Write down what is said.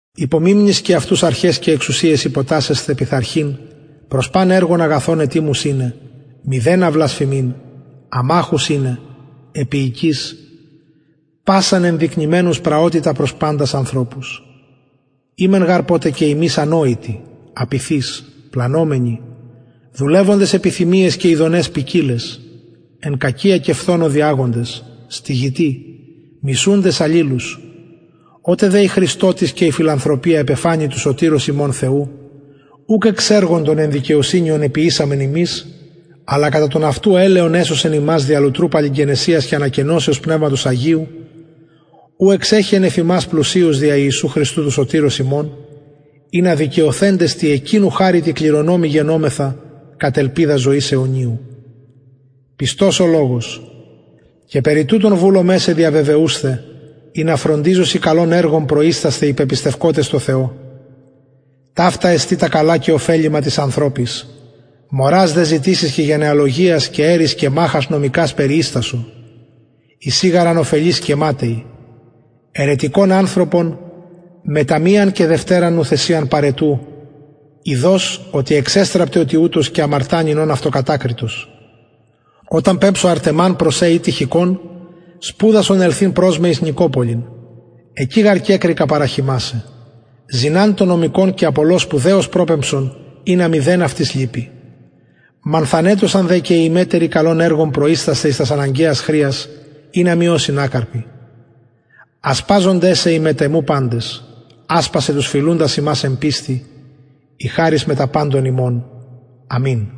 υπομιμνησκε αυτους αρχαις και εξουσιαις υποτασσεσθαι πειθαρχειν προς παν εργον αγαθον ετοιμους ειναι μηδενα βλασφημειν αμαχους ειναι επιεικεις πασαν ενδεικνυμενους πραοτητα προς παντας ανθρωπους ημεν γαρ ποτε και ημεις ανοητοι απειθεις πλανωμενοι δουλευοντες επιθυμιαις και ηδοναις ποικιλαις εν κακια και φθονω διαγοντες στυγητοι μισουντες αλληλους οτε δε η χρηστοτης και η φιλανθρωπια επεφανη του σωτηρος ημων θεου ουκ εξ εργων των εν δικαιοσυνη ων εποιησαμεν ημεις αλλα κατα τον αυτου ελεον εσωσεν ημας δια λουτρου παλιγγενεσιας και ανακαινωσεως πνευματος αγιου ου εξεχεεν εφ ημας πλουσιως δια ιησου χριστου του σωτηρος ημων ινα δικαιωθεντες τη εκεινου χαριτι κληρονομοι γενωμεθα κατ ελπιδα ζωης αιωνιου πιστος ο λογος και περι τουτων βουλομαι σε διαβεβαιουσθαι ινα φροντιζωσιν καλων εργων προιστασθαι οι πεπιστευκοτες θεω ταυτα εστιν τα καλα και ωφελιμα τοις ανθρωποις μωρας δε ζητησεις και γενεαλογιας και ερεις και μαχας νομικας περιιστασο εισιν γαρ ανωφελεις και ματαιοι αιρετικον ανθρωπον μετα μιαν και δευτεραν νουθεσιαν παραιτου ειδως οτι εξεστραπται ο τοιουτος και αμαρτανει ων αυτοκατακριτος οταν πεμψω αρτεμαν προς σε η τυχικον σπουδασον ελθειν προς με εις νικοπολιν εκει γαρ κεκρικα παραχειμασαι ζηναν τον νομικον και απολλω σπουδαιως προπεμψον ινα μηδεν αυτοις λειπη μανθανετωσαν δε και οι ημετεροι καλων εργων προιστασθαι εις τας αναγκαιας χρειας ινα μη ωσιν ακαρποι ασπαζονται σε οι μετ εμου παντες ασπασαι τους φιλουντας ημας εν πιστει η χαρις μετα παντων υμων αμην